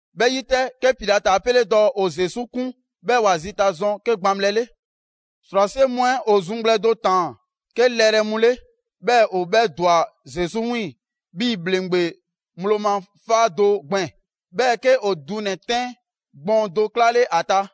'Bhɛ 'yi 'tɛ, 'ke Pilati 'a 'pele dɔɔ ‑o Zesu 'kun 'bhɛɛ‑ ‑wa zita zɔn 'ke gbaŋbhlɛ 'le. ‑Srwase' mu 'ɛ ‑o zuŋgblɛ do ꞊taan 'ke lɛrɛ mu 'le, 'bhɛɛ‑ ‑o 'bhɛ ‑dwa Zesu 'wiiŋ‑ 'bhii‑ ‑bhleŋgbe ŋgblo ma 'faa do gbɛɛn‑. 'Bhɛɛ‑ 'ke ‑o dunɛ‑ 'tɛn gbɔɔn do 'klale ‑a ta.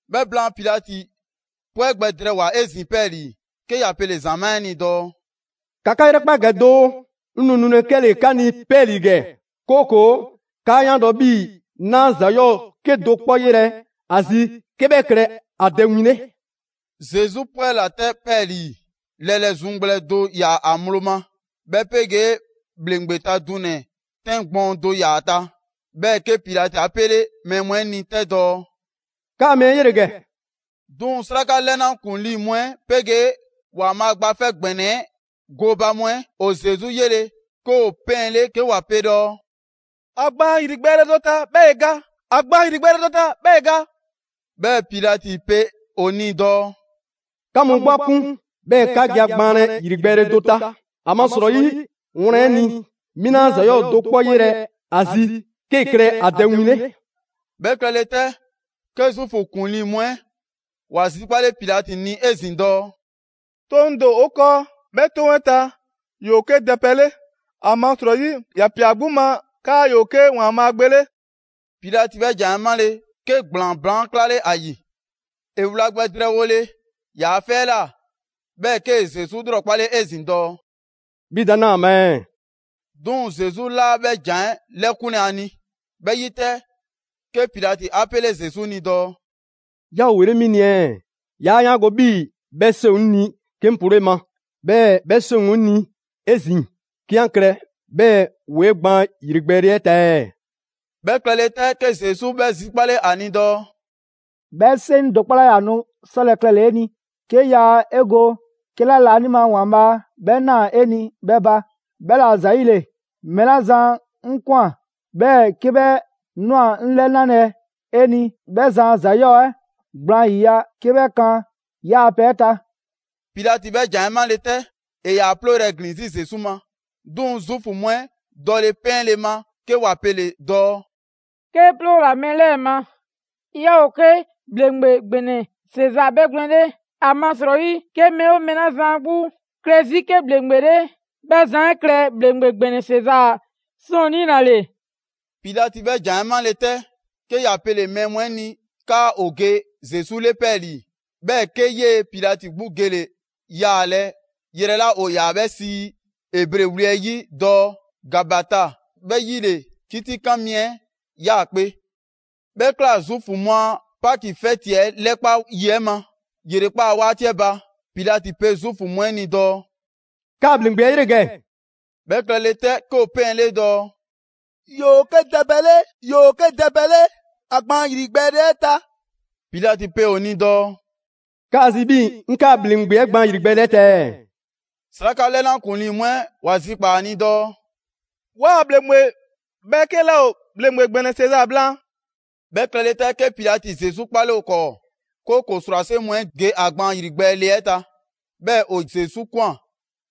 'Bhɛ blaan, Pilati 'pwɛ gbɛ drɛɛwoa‑ 'ezin‑ 'pɛɛlii‑, 'ke ‑ya pele‑ ‑zamaa' 'ɛ ni dɔɔ: «‑Ka 'ka 'yrɛkpa ‑gɛ doo, 'ŋ nu nulɛ 'kɛle‑ 'ka ni 'pɛɛlii‑ ‑gɛ, 'kooko‑ 'kaa 'yaango‑ 'bhii‑ 'naa ‑za 'yɔɔ 'kedo‑ 'kpɔ 'yelɛ‑ ‑a zi 'ke 'bhɛ klɛ ‑a dɛ win 'le.» Zesu 'pwɛla‑ 'tɛ 'pɛɛlii‑; lɛlɛ zuŋgblɛ do ‑yaa ‑a ŋgblo ma, 'bhɛ 'pegee ‑bhleŋgbe ta dunɛ‑ 'tɛn gbɔɔn do ‑yaa ‑a ta. 'Bhɛɛ‑ 'ke Pilati 'a 'pele mɛɛ mu 'ɛ ni 'tɛ dɔɔ: «'Kaa‑ mɛɛ 'ɛ 'yele‑ ‑gɛ!» 'Duŋ‑ 'sraka 'lɛna ‑kuŋlii mu 'ɛ 'pegee ‑Waanbhaa' gba 'Fɛ ‑Gbɛnɛ 'ɛ gooba mu 'ɛ ‑o Zesu 'yele‑, 'ke ‑o 'pɛɛnle 'ke ‑wa pe dɔɔ: «‑A gbaan ‑yrigbɛɛle do ta, 'bhɛɛ‑ ‑e ga! ‑A gbaan ‑yrigbɛɛle do ta, 'bhɛɛ‑ ‑e ga!» 'Bhɛɛ‑ Pilati pe ‑o ni dɔɔ: «'Ka mu 'gbu 'a 'kun, 'bhɛɛ‑ 'ka ge a gbaanlɛ ‑yrigbɛɛle do ta, ‑amasrɔyi, wlan 'ɛ ni, 'mi 'naa ‑za 'yɔɔ‑ do 'kpɔ 'yelɛ‑ ‑a zi 'ke klɛ ‑a dɛ win 'le.» 'Bhɛ klɛle 'tɛ, 'ke Zuufu ‑kuŋlii mu 'ɛ ‑wa zikpale Pilati ni 'ezin‑ dɔɔ: «'Toŋ do ‑o 'o 'kɔɔ, 'bhɛ 'toŋ 'ɛ ta, ‑yoo 'ke dɛ pɛ 'le, ‑amasrɔyi ‑ya ‑pia ‑a 'gbu ma 'kaa ‑yoo 'ke ‑Waanbhaa' Gbe 'le.» Pilati 'bhɛ ‑jan 'ɛ 'male‑, 'ke ‑gblaan baan' 'klale ‑a ‑yi. ‑E wla gbɛ drɛɛwole ‑yaa' 'fɛ 'ɛ ꞊la, 'bhɛɛ‑ 'kee‑ Zesu 'lrɔkpale 'ezin‑ dɔɔ: «'Bhi da 'naa‑ ‑a ma ɛɛ?» 'Duŋ‑ Zesu 'laa 'bhɛ ‑jan 'ɛ 'lɛkunlɛ ‑a ni. 'Bhɛ 'yi 'tɛ, 'ke Pilati 'a 'pele Zesu ni dɔɔ: «'Yaa ‑o ‑wele' 'mi ni ɛɛ? 'Yaa 'yaango‑ 'bhii‑ 'bhɛ 'seŋ ‑o 'ŋ ni 'ke 'ŋ ploo 'e ma, 'bhɛɛ‑ 'bhɛ 'seŋ ‑o 'ŋ ni 'ezin‑ 'ke 'an klɛ 'bhɛɛ‑ ‑woo 'e gbaan ‑yrigbɛɛle 'ɛ ta ɛɛ?» 'Bhɛ klɛle 'tɛ, 'ke Zesu 'bhɛ zikpale ‑a ni dɔɔ: «'Bhɛ 'seŋ do 'kpɔ 'laa ‑yaa nu 'sɔlɛ‑ klɛle‑ 'e ni, 'ke yaa 'e go 'kɛla laanima ‑Waanbhaa' 'bhɛ ꞊naa 'e ni 'bhɛ ba. 'Bhɛla‑ ‑zayile mɛɛ 'la zan 'ŋ ꞊kwan, 'bhɛɛ‑ 'ke 'bhɛ ꞊nwa 'ŋ 'lɛnalɛ 'e ni, 'bhɛ zan a ‑za 'yɔɔ‑ 'ɛ gblaan 'yiya‑ 'ke 'bhɛ kan 'yaa‑ pɛ 'ɛ ta.» Pilati 'bhɛ ‑jan 'ɛ 'male 'tɛ, ‑e ‑yaa 'plooyrɛ‑ ‑glin 'zi Zesu ma. 'Duŋ‑ Zuufu mu 'ɛ dɔle 'pɛɛnle‑ ma 'ke ‑wa pele‑ dɔɔ: «'Kee 'ploola‑ mɛɛ 'lɛɛ‑ ma, 'yaa ‑o 'ke ‑bhleŋgbe ‑gbɛnɛ Sezaa 'bhɛgwlɛn‑ 'le. ‑Amasrɔyi 'ke mɛɛ 'oo mɛɛ 'la zan 'a 'gbu klɛ 'zi 'ke ‑bhleŋgbe 'le 'bhɛ zan 'ɛ klɛ ‑bhleŋgbe ‑gbɛnɛ Sezaa ‑sɔɔnnii' ‑la ‑le.» Pilati 'bhɛ ‑jan 'ɛ 'male‑ 'tɛ, 'ke ‑ya pele‑ mɛɛ mu 'ɛ ni 'kaa ‑o ge Zesu 'le 'pɛɛlii‑; 'bhɛɛ‑ 'ke 'yee‑ Pilati 'gbu gele‑ yaalɛ yrɛ 'la ‑o ‑yaa 'bhɛ sii Ebre wli 'ɛ 'yi dɔɔ: ‹Gabata›. 'Bhɛ 'yi ‑le 'kitikan mi 'ɛ 'yaakpe‑. 'Bhɛ ꞊kla Zuufu mu a Paki 'fɛti 'ɛ 'lɛkpa yi 'ɛ ma, ‑yrekpaa' 'waati 'ɛ ba. Pilati pe Zuufu mu 'ɛ ni dɔɔ: «'Kaa‑ ‑bhleŋgbe 'ɛ 'yele‑ ‑gɛ!» 'Bhɛ klɛle 'tɛ, 'ke ‑o 'pɛɛnle dɔɔ: «‑Yoo 'ke dɛ pɛ 'le! ‑Yoo 'ke dɛ pɛ 'le! ‑A gbaan ‑yrigbɛɛle 'ɛ ta!» Pilati pe ‑o ni dɔɔ: «'Kaa‑ zi 'bhii‑ 'ŋ 'kaa‑ ‑bhleŋgbe 'ɛ gbaan ‑yrigbɛɛle ta ɛɛ?» 'Sraka 'lɛna ‑kuŋlii mu 'ɛ ‑wa zikpaa‑ ‑a ni dɔɔ: «'Waa‑ ‑bhleŋgbe 'bhɛɛke 'laa ‑o ‑bhleŋgbe ‑gbɛnɛ Sezaa blaan.» 'Bhɛ klɛle 'tɛ, 'ke Pilati Zesu 'kpale ‑o 'kɔɔ, 'kooko‑ ‑srwase' mu 'ɛ ge ‑a gbaan ‑yrigbɛɛle 'ɛ ta. 'Bhɛɛ‑ ‑o Zesu ꞊kwan,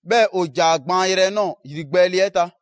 'bhɛɛ‑ ‑o ‑ja ‑a gbaan yrɛ nɔɔ‑ ‑yrigbɛɛle 'ɛ ta.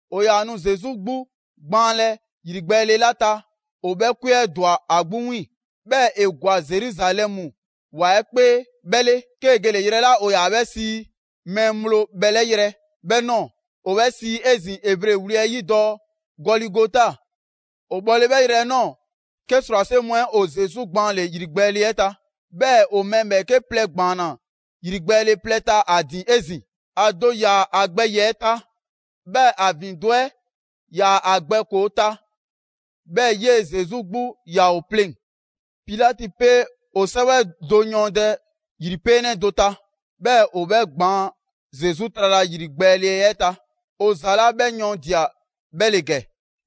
‑O ‑yaa nu Zesu 'gbu gbaanlɛ ‑yrigbɛɛle 'la ta, ‑o 'bhɛ 'kwe 'ɛ ‑dwa ‑a 'gbu 'wiiŋ‑. 'Bhɛɛ‑ ‑e ‑gwa Zeruzalɛmu ‑wa 'ɛ 'kpee 'bhɛ 'le, 'kee‑ gele‑ yrɛ 'la ‑o ‑yaa 'bhɛ sii: «Mɛɛ ŋgblo bhɛlɛ' yrɛ» 'bhɛ ꞊nɔɔ, ‑o 'bhɛ sii 'ezin‑ Ebre wli 'ɛ 'yi dɔɔ: «Gɔligota» ‑O bhɔle 'bhɛ yrɛ 'ɛ ꞊nɔɔ, 'ke ‑srwase' mu 'ɛ ‑o Zesu gbaanle‑ ‑yrigbɛɛle 'ɛ ta. 'Bhɛɛ‑ ‑o mɛɛ ‑bhɛɛke' plɛ ‑gbaanna ‑yrigbɛɛle plɛ ta ‑a ‑din 'ezin‑: ‑a do ‑yaa ‑a gbɛ ‑yiɛ' ta, 'bhɛɛ‑ ‑a ‑vindo' 'ɛ 'yaa‑ ‑a gbɛ ‑koo ta, 'bhɛɛ‑ 'yee‑ Zesu 'gbu 'yaa‑ ‑o pleŋ‑. Pilati pe ‑o 'sɛwɛ do yɔɔndɛ ‑yripeenɛ do ta, 'bhɛɛ‑ ‑o 'bhɛ gbaan Zesu trala ‑yrigbɛɛle 'ɛ ta. ‑O ‑za 'la 'bhɛ yɔɔndia‑ 'bhɛ ‑le ‑gɛ: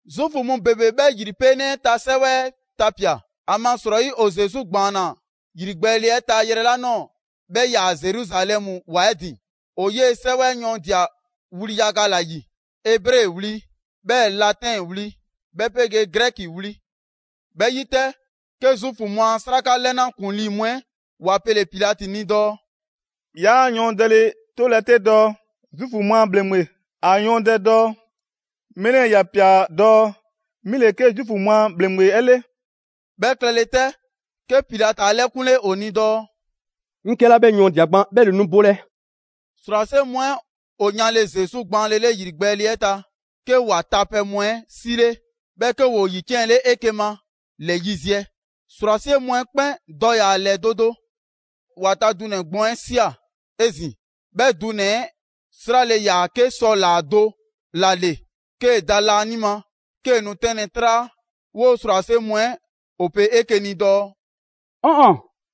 Zuufu mu ‑bebe 'bhɛ ‑yripeenɛ 'ɛ ta 'sɛwɛ 'ɛ tapia‑, ‑amasrɔyi ‑o Zesu ‑gbaanna ‑yrigbɛɛle 'ɛ ta yrɛ 'la ꞊nɔɔ, 'bhɛ 'yaa‑ Zeruzalɛmu ‑wa 'ɛ ‑din. ‑O 'yee‑ 'sɛwɛ 'ɛ yɔɔndia‑ wli yaga ‑la ‑yi: Ebre wli, 'bhɛɛ‑ Latɛn wli, 'bhɛ 'pegee Grɛki wli. 'Bhɛ 'yi 'tɛ, 'ke Zuufu mu a 'sraka 'lɛna ‑kuŋlii mu 'ɛ ‑wa pele‑ Pilati ni dɔɔ: «'Yaa yɔɔndɛle 'tolɛ‑ 'te dɔɔ: ‹Zuufu mu a ‑bhleŋgbe›. ‑A yɔɔndɛ dɔɔ: ‹Mɛɛ 'lɛɛ‑ ‑ya ‑pia dɔɔ: 'Mi ‑le 'ke Zuufu mu a ‑bhleŋgbe 'ɛ 'le.›» 'Bhɛ klɛle 'tɛ, 'ke Pilati 'a 'lɛkunle ‑o ni dɔɔ: «'Ŋ 'kɛla 'bhɛ yɔɔndia‑ gban 'bhɛ ‑le nu bolɛ.» ‑Srwase' mu 'ɛ ‑o yanle Zesu gbaanlele ‑yrigbɛɛle 'ɛ ta, 'ke ‑wa tapɛ mu 'ɛ 'sile, 'bhɛɛ‑ 'ke ‑woo ‑yiciɛnle 'eke‑ ma ‑lɛ yiziɛ: ‑srwase' mu 'ɛ 'kpɛn dɔ ‑yaa ‑lɛ do do. ‑Wa ta dunɛ‑ gbɔɔn 'ɛ ꞊sia 'ezin‑; 'Bhɛ dunɛ‑ 'ɛ 'srale‑ ‑yaa 'ke sɔ ‑laa do ‑la ‑le 'kee‑ da laanima, 'kee‑ nu 'tɛnlɛ‑ 'traa. 'Woo‑ ‑srwase' mu 'ɛ ‑o pe 'eke‑ ni dɔɔ: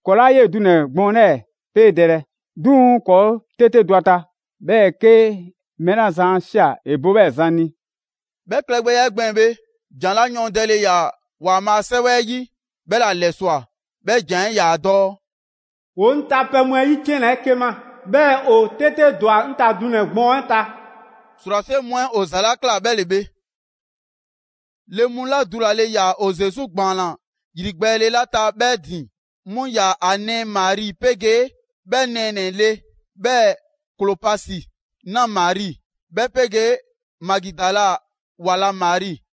«‑Kɔɔ' 'laa 'yee‑ dunɛ‑ gbɔɔn 'lɛɛ‑ 'peedɛlɛ, 'duŋ‑ ‑kɔɔ' 'tete dɔ ‑a ta, 'bhɛɛ‑ 'ke mɛɛ la zan 'a ꞊sia ‑e bo 'bhɛɛ‑ zan ni.» 'Bhɛ klɛgbɛya 'ɛ gbɛɛn‑ bhe, ‑jan 'la yɔɔndɛle ‑yaa ‑Waanbhaa' 'sɛwɛ 'ɛ 'yi, 'bhɛ 'la ‑lɛswa꞊, 'bhɛ ‑jan 'ɛ 'yaa‑ dɔɔ: «‑Woo 'ŋ tapɛ mu 'ɛ 'yiciɛnna 'eke‑ ma. 'Bhɛɛ‑ ‑o 'tete ‑dwa 'ŋ ta dunɛ‑ gbɔɔn 'ɛ ta.» ‑Srwase' mu 'ɛ ‑o ‑za 'la ꞊kla 'bhɛ ‑le bhe. Le mu 'la dulale ‑yaa ‑o Zesu ‑gbaanna ‑yrigbɛɛle 'la ta 'bhɛ ‑din, 'mu ‑yaa ‑a nɛɛ Mari 'pegee 'bhɛ nɛɛnɛ‑ le, 'bhɛɛ‑ Klopasi 'na Mari, 'bhɛ 'pegee Magidala ‑wa la Mari.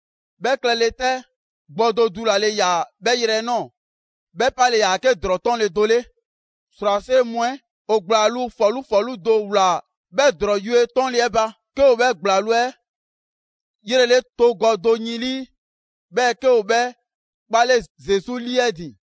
'Bhɛ klɛle 'tɛ, gbɔ do dulale ‑yaa 'bhɛ yrɛ 'ɛ ꞊nɔɔ. 'Bhɛ 'pale‑ ‑yaa 'ke ‑drɔɔ 'tɔnle‑ do 'le. ‑Srwase' mu 'ɛ ‑o ‑gblaŋluu' ‑fɔlu' 'fɔlu do ꞊wlaa 'bhɛ ‑drɔɔ yue 'tɔnle 'ɛ ba. 'Ke ‑o 'bhɛ ‑gblaŋluu' 'ɛ 'yrele togɔ do yin 'lii, 'bhɛɛ‑ 'ke ‑o 'bhɛ 'kpale Zesu 'lii 'ɛ ‑din.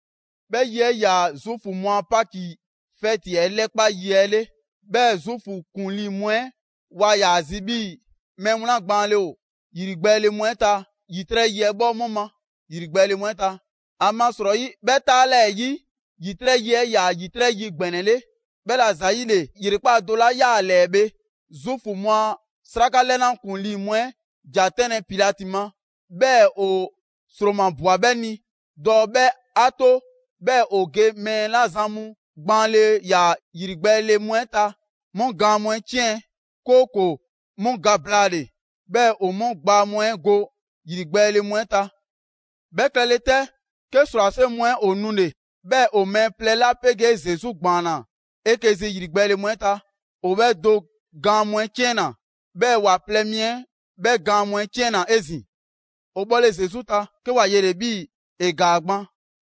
'Bhɛ yi 'ɛ 'yaa‑ Zuufu mu a Paki 'fɛti 'ɛ 'lɛkpa yi 'ɛ 'le. 'Bhɛɛ‑ Zuufu ‑kuŋlii mu 'ɛ waa ‑yaa zi 'bhii‑ mɛɛ mu 'la gbaanle ‑o ‑yrigbɛɛle mu 'ɛ ta, ‑yitrɛ' yi 'ɛ 'bhɔ 'mu ma ‑yrigbɛɛle mu 'ɛ ta. ‑Amasrɔyi, 'bhɛ 'taalɛɛyi ‑yitrɛ' yi 'ɛ 'yaa‑ ‑yitrɛ' yi ‑gbɛnɛ 'le. 'Bhɛla ‑zayile ‑yrekpaa' do 'la 'yaa‑ ‑a ‑lɛɛ bhe, Zuufu mu a 'sraka 'lɛna ‑kuŋlii mu 'ɛ ‑ja 'tɛnlɛ‑ Pilati ma, 'bhɛɛ‑ ‑o ‑sromabwa 'bhɛ ni dɔɔ 'bhɛ 'a 'to 'bhɛɛ‑ ‑o ge mɛɛ 'la zan mu gbaanle ‑yaa ‑yrigbɛɛle mu 'ɛ ta 'mu gaan mu 'ɛ 'ciɛn, 'kooko‑ 'mu ga blaale, 'bhɛɛ‑ ‑o 'mu ‑gbaa mu 'ɛ go ‑yrigbɛɛle mu 'ɛ ta. 'Bhɛ klɛle 'tɛ, 'ke ‑srwase' mu 'ɛ ‑o nule‑, 'bhɛɛ‑ ‑o mɛɛ plɛ 'la 'pegee Zesu ‑gbaanna 'eke‑ zi ‑yrigbɛɛle mu 'ɛ ta, ‑o 'bhɛ do gaan mu 'ɛ 'ciɛnna‑, 'bhɛɛ‑ ‑wa plɛ mi 'ɛ 'bhɛ gaan mu 'ɛ 'ciɛnna‑ 'ezin‑. ‑O bhɔle Zesu ta, 'ke ‑wa yele‑ 'bhii‑ ‑e ‑gaa gban;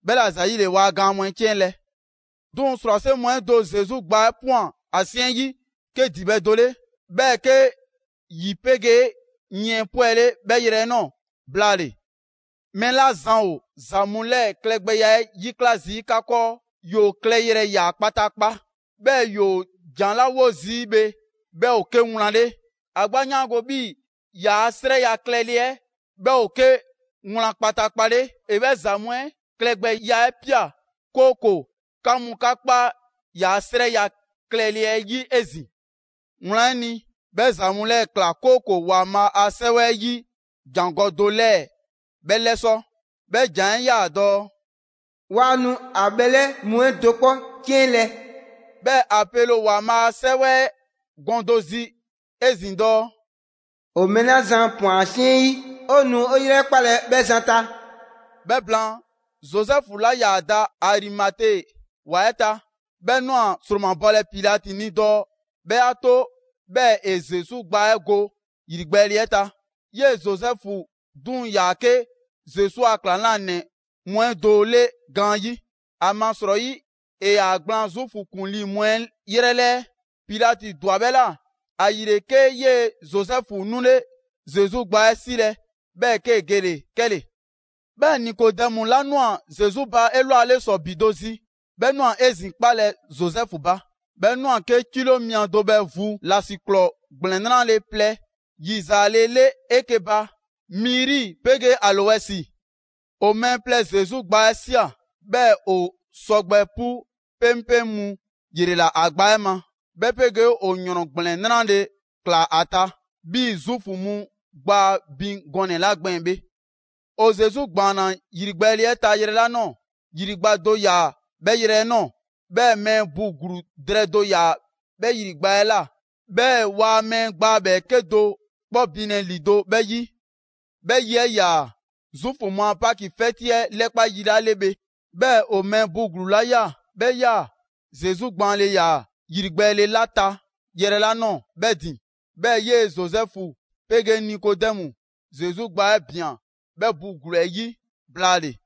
'bhɛla‑ ‑zayile waa gaan mu 'ɛ 'ciɛnlɛ‑. 'Duŋ‑ ‑srwase' mu 'ɛ do Zesu gbaa 'ɛ ꞊pwan ‑a 'siɛn 'yi 'ke ‑dibhɛ' do 'le. 'Bhɛɛ‑ 'ke ‑yi 'pegee yiɛn 'pwɛle 'bhɛ yrɛ 'ɛ ꞊nɔɔ blaale‑. Mɛɛ 'la zan ‑o ‑za mu 'lɛɛ‑ klɛgbɛya 'ɛ 'yikla zii' 'ka 'kɔɔ, ‑yoo klɛyrɛ ꞊ya kpataakpa. 'Bhɛɛ‑ ‑yoo ‑jan 'la 'wo zii' bhe 'bhɛ ‑o 'ke wlan 'le. ‑A 'gbu 'a 'yaango‑ 'bhii‑ ‑yaa' 'srɛya‑ klɛle 'ɛ 'bhɛ ‑o 'ke wlan kpataakpa 'le. ‑E 'bhɛ ‑za mu 'ɛ klɛgbɛya 'ɛ ꞊pia, 'kooko‑ 'ka mu 'ka kpa ‑yaa' 'srɛya‑ klɛle 'ɛ 'yi 'ezin‑. Wlan 'ɛ ni, bhɛ ‑za mu 'lɛɛ‑ ꞊kla, 'kooko‑ ‑Waanbhaa' a 'Sɛwɛ 'ɛ 'yi ‑jangɔ' do 'lɛɛ‑ 'bhɛ 'lɛsɔ‑; 'bhɛ ‑jan 'ɛ 'yaa‑ dɔɔ: «Waa nu ‑a bhɛlɛ' mu 'ɛ do 'kpɔ 'ciɛnlɛ‑.» 'Bhɛɛ‑ ‑a pele ‑o ‑Waanbhaa' a 'Sɛwɛ 'ɛ gɔn do zi 'ezin‑ dɔɔ: «‑O mɛɛ 'la zan ‑pwan ‑a 'siɛn 'yi, ‑o nu ‑o ‑yrɛkpalɛ 'bhɛ zan ta.» 'Bhɛ blaan, Zozɛfu 'la 'yaa‑ da Arimate ‑wa 'ɛ ta, 'bhɛ ꞊nwa ‑sromabɔlɛ Pilati ni dɔɔ 'bhɛ 'a 'to 'bhɛɛ‑ ‑e Zesu gbaa 'ɛ go ‑yrigbɛɛle 'ɛ ta. 'Yee‑ Zozɛfu 'duŋ‑ ‑yaa 'ke Zesu a ‑klaŋlanɛ mu 'ɛ do 'le gaanyi', ‑amasrɔyi ‑e ‑yaa ‑gblaan Zuufu ‑kuŋlii mu 'ɛ 'yrɛ 'lɛɛ. Pilati ‑dwa 'bhɛ ꞊la. ‑Ayile 'ke 'yee‑ Zozɛfu 'nule Zesu gbaa 'ɛ 'silɛ‑, 'bhɛɛ‑ 'kee‑ gele‑ 'kɛle‑. 'Bhɛɛ‑ Nikodɛmu 'la ꞊nwa Zesu ba 'elwale ‑sɔ ‑bi do zi, 'bhɛ ꞊nwa 'ezin‑ 'kpalɛ‑ Zozɛfu ba. 'Bhɛ ꞊nwa 'ke 'kilo mia do bhɛ vu ‑lasiklɔɔ ‑gblɛn 'nrale‑ plɛ ‑yizaale 'le 'eke‑ ba: miri 'pegee aloɛsi. ‑O mɛɛ plɛ Zesu gbaa 'ɛ ꞊sia, 'bhɛɛ‑ ‑o sɔgbɛ 'pu 'peŋpeŋ mu ‑yrela ‑a gbaa 'ɛ ma, 'bhɛ 'pegee ‑o ‑yrɔn ‑gblɛn 'nrale‑ ꞊klaa 'a ta, 'bhii‑ Zuufu mu gbaa bin gɔnɛ‑ 'la gbɛɛn‑ bhe. ‑O Zesu ‑gbaanna ‑yrigbɛɛle 'ɛ ta yrɛ 'la ꞊nɔɔ, ‑yri gba do ‑yaa 'bhɛ yrɛ 'ɛ ꞊nɔɔ. 'Bhɛɛ‑ mɛɛ bu ‑gluu drɛɛ do ‑yaa 'bhɛ ‑yri gba 'ɛ ꞊la, 'bhɛɛ‑ ‑waa mɛɛ gbaa ‑bhɛɛke' do 'kpɔ binlɛ ‑lido' 'bhɛ 'yi. 'Bhɛ yi 'ɛ 'yaa‑ Zuufu mu a Paki 'fɛti 'ɛ 'lɛkpa yi 'la 'le bhe, 'bhɛɛ‑ ‑o mɛɛ bu ‑gluu 'la ꞊ya, 'bhɛ 'yaa‑ Zesu gbaanle ‑yaa ‑yrigbɛɛle 'la ta yrɛ 'la ꞊nɔɔ 'bhɛ ‑din. 'Bhɛɛ‑ 'yee‑ Zozɛfu 'pegee Nikodɛmu Zesu gbaa 'ɛ ꞊bian 'bhɛ bu ‑gluu 'ɛ 'yi blaale‑.